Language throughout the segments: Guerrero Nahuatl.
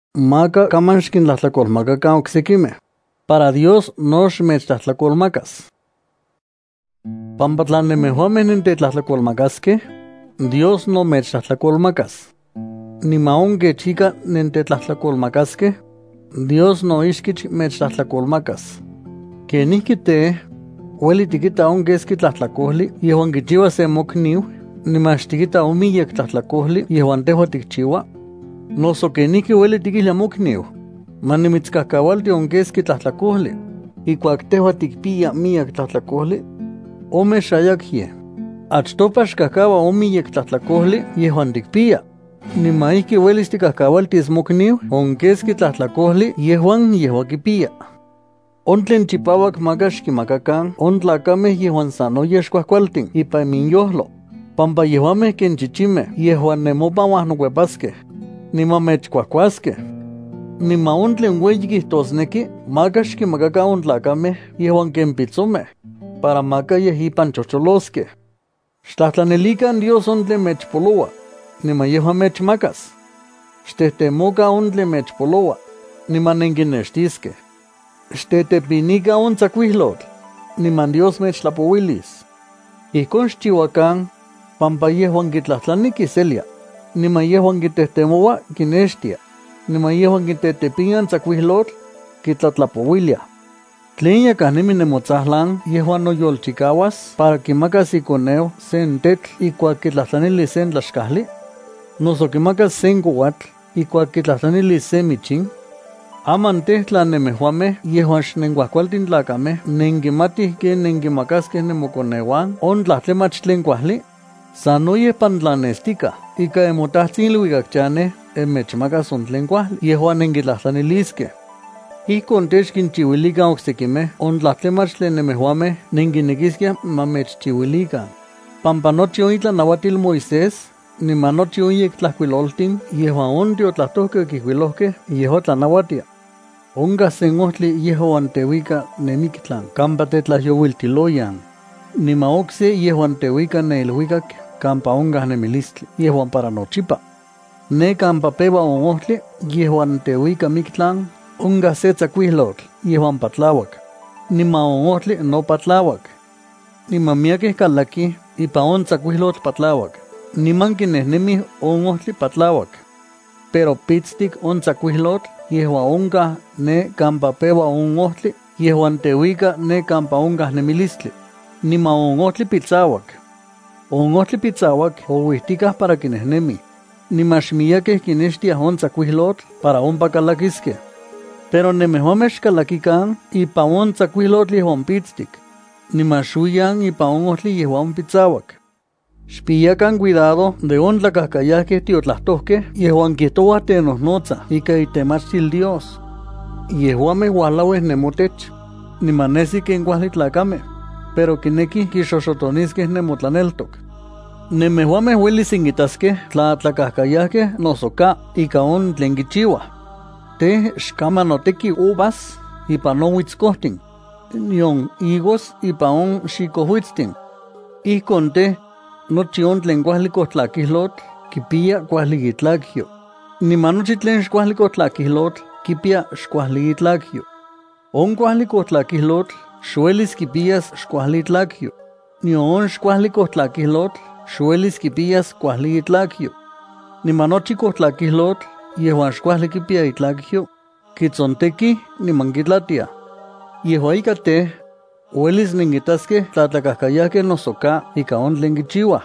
’Maka kaman xkintlajtlakolmakakan oksekimej, para Dios no xmechtlajtlakolmakas, pampa tla nemejuamej nentetlajtlakolmakaskej, Dios no mechtlajtlakolmakas. Niman on kech ika nentetlajtlakolmakaskej, Dios no ichkich mechtlajtlakomakas. ¿Kenijki tej, ueli tikita on keski tlajtlakojli yejuan kichiua sen mokniu niman xtikita on miyek tlajtlakojli yejuan tejua tikchiua? Noso, ¿kenijki ueli tikijlia mokniu: “Ma nimitskajkaualti on keski tlajtlakojli”, ijkuak tejua tikpiya miyek tlajtlakojli? ¡Omexayakyej! Achtopa xkajkaua on miyek tlajtlakojli yejuan tikpiya, niman ijki uelis tikajkaualtis mokniu on keski tlajtlakojli yejuan yejua kipiya. ’On tlen chipauak maka xkinmakakan on tlakamej yejuan sanoyej xkuajkualtin ipan inyojlo, pampa yejuamej ken chichimej yejuan nemopan uajnokuepaskej, niman mechkuajkuaskej. Niman on tlen ueyi kijtosneki maka xkinmakakan on tlakamej yejuan ken pitsomej, para maka yej ipan chojcholoskej. ’Xtlajtlanilikan Dios on tlen mechpoloua, niman yejua mechmakas. Xtejtemokan on tlen mechpoloua, niman nenkinextiskej. Xtetepinikan on tsakuiljyotl, niman Dios mechtlapouilis. Ijkon xchiuakan, pampa yejuan kitlajtlani kiselia, niman yejuan kitejtemoua kinextia, niman yejuan kitetepinia on tsakuijlotl, kitlatlapouiliaj. ’¿Tlen yakaj nemi nemotsajlan yejuan noyolchikauas para kimakas ikoneu sen tetl ijkuak kitlajtlanilis sen tlaxkajli? ¿Noso kimakas sen kouatl ijkuak kitlajtlanilis sen michin? Aman tej, tla nemejuamej yejuan xnenkuajkualtin tlakamej nenkimatij ken nenkinmakaskej nemokoneuan on tlajtlamach tlen kuajli, sanoyej pantlannestikaj ika nemoTajtsin iluikak chanej mechmakas on tlen kuajli yejuan nenkitlajtlaniliskej. ’Ijkon tej, xkinchiuilikan oksekimej on tlajtlamach tlen nemejuamej nenkinekiskiaj ma mechchiuilikan, pampa nochi on itlanauatil Moisés niman nochi on yektlajkuilotin yejuan on tiotlajtojkej okijkuilojkej, yejua tlanauatia. ’Onkaj sen ojtli yejuan teuika ne miktlan kampa tetlajyouiltiloyan, niman okse yejuan teuika ne iluikak kampa onkaj nemilistli yejuan para nochipa. Ne kampa peua on ojtli yejuan teuika miktlan onkaj sen tsakuijlotl yejuan patlauak, niman on ojtli no patlauak. Niman miyekej kalakij ipan on tsakuijlotl patlauak niman kinejnemij on ojtli patlauak. Pero pitstik on tsakuijlotl yejuan onkaj ne kampa peua on ojtli yejuan teuika ne kampa onkaj nemilistli, niman on ojtli pitsauak. On ojtli pitsauak ouijtikaj para kinejnemij, niman xmiyekej kinextiaj on tsakuijlotl para ompa kalakiskej. Pero nemejuamej xkalakikan ipan on tsakuijlotl yejuan pitstik, niman xuiyan ipan on ojtli yejuan pitsauak. ’Xpiyakan cuidado de on tlakajkayajkej tiotlajtojkej yejuan kijtouaj tenojnotsaj ikan itemachtil Dios. Yejuamej uajlauij nemotech, niman nesij ken kuajli tlakamej, pero kinekij kixoxotoniskej nemotlaneltok. Nemejuamej uelis nenkintaskej tla tlakajkayajkej noso ka ika on tlen kichiuaj. Tej, xkaman noteki uvas ipan on uitskojtin, nion higos ipan on xikojuitstin. Ijkon tej, nochi tlen kuajli kojtlakijlotl kipiya kuajli itlakyo, niman nochi tlen xkuajli kojtlakijlotl kipiya xkuajli itlakyo. On kuajli kojtlakijlotl xuelis kipiyas xkuajli itlakyo, nion on xkuajli kojtlakijlotl xuelis kipiyas kuajli itlakyo. Niman nochi kojtlakijlotl yejuan xkuajli kipiya itlakyo, kitsontekij niman kitlatiaj. Yejua ika tej, uelis nenkintaskej tla tlakajkayajkej noso ka ika on tlen kichiuaj.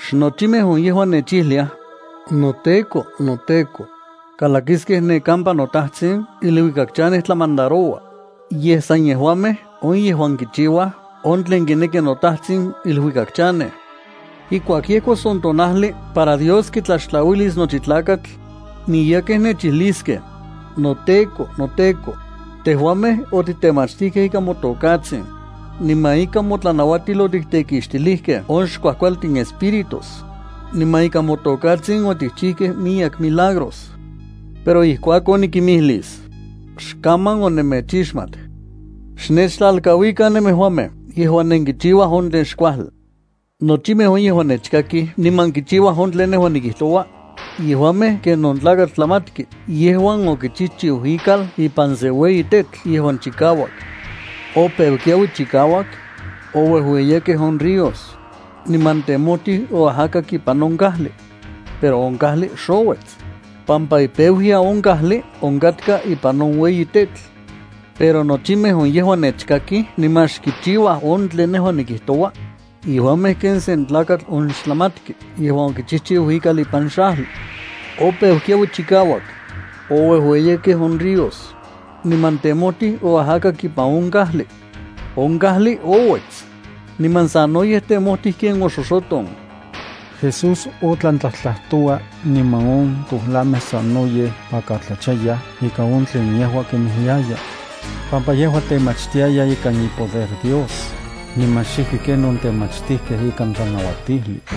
’Xnochimej on yejuan nechijliaj: “NoTEKO, noTEKO”, kalakiskej ne kampa noTajtsin iluikak chanej tlamandaroua, yej san yejuamej on yejuan kichiuaj on tlen kineki noTajtsin iluikak chanej. Ijkuak yejkos on tonajli para Dios kitlaxtlauilis nochi tlakatl, miyekej nechijliskej: “NoTEKO, noTEKO, tejuamej otitemachtijkej ikan motokatsin, niman ikan motlanauatil otiktekixtilijkej on xkuajkualtin espíritus, niman ikan motokatsin otikchijkej miyek milagros.” Pero ijkuakon nikimijlis: “Xkaman onemechixmat. Xnechtlalkauikan nemejuamej yejuan nenkichiuaj on tlen xkuajli.” ’Nochimej on yejuan nechkakij niman kichiuaj on tlen nejua nikijtoua, yejuamej ken on tlakatl tlajmatki yejuan okichijchiu ikal ipan sen ueyi tetl yejuan chikauak. Opeu kiaui chikauak, ouejueyiyakej on ríos, niman temojtij oajakak ipan on kajli. Pero on kajli xouets, pampa ipeuyan on kajli onkatka ipan on ueyi tetl. Pero nochimej on yejuan nechkakij niman xkichiuaj on tlen nejua nikijtoua, yejuamej ken sen tlakatl on xtlajmatki yejuan okichijchiu ikal ipan xajli. Opeu kiaui chikauak, ouejueyiyakej on ríos, niman temojtij oajakak ipan on kajli. On kajli ouets, niman sanoyej temojtij ken oxoxoton. Jesús otlan tlajtlajtoua niman on tojlamej sanoyej pakatlachayaj ika on tlen yejua kinmijliaya, pampa yejua temachtiaya ikan ipoder Dios, niman xijki ken on temachtijkej ikan tlanauatijli.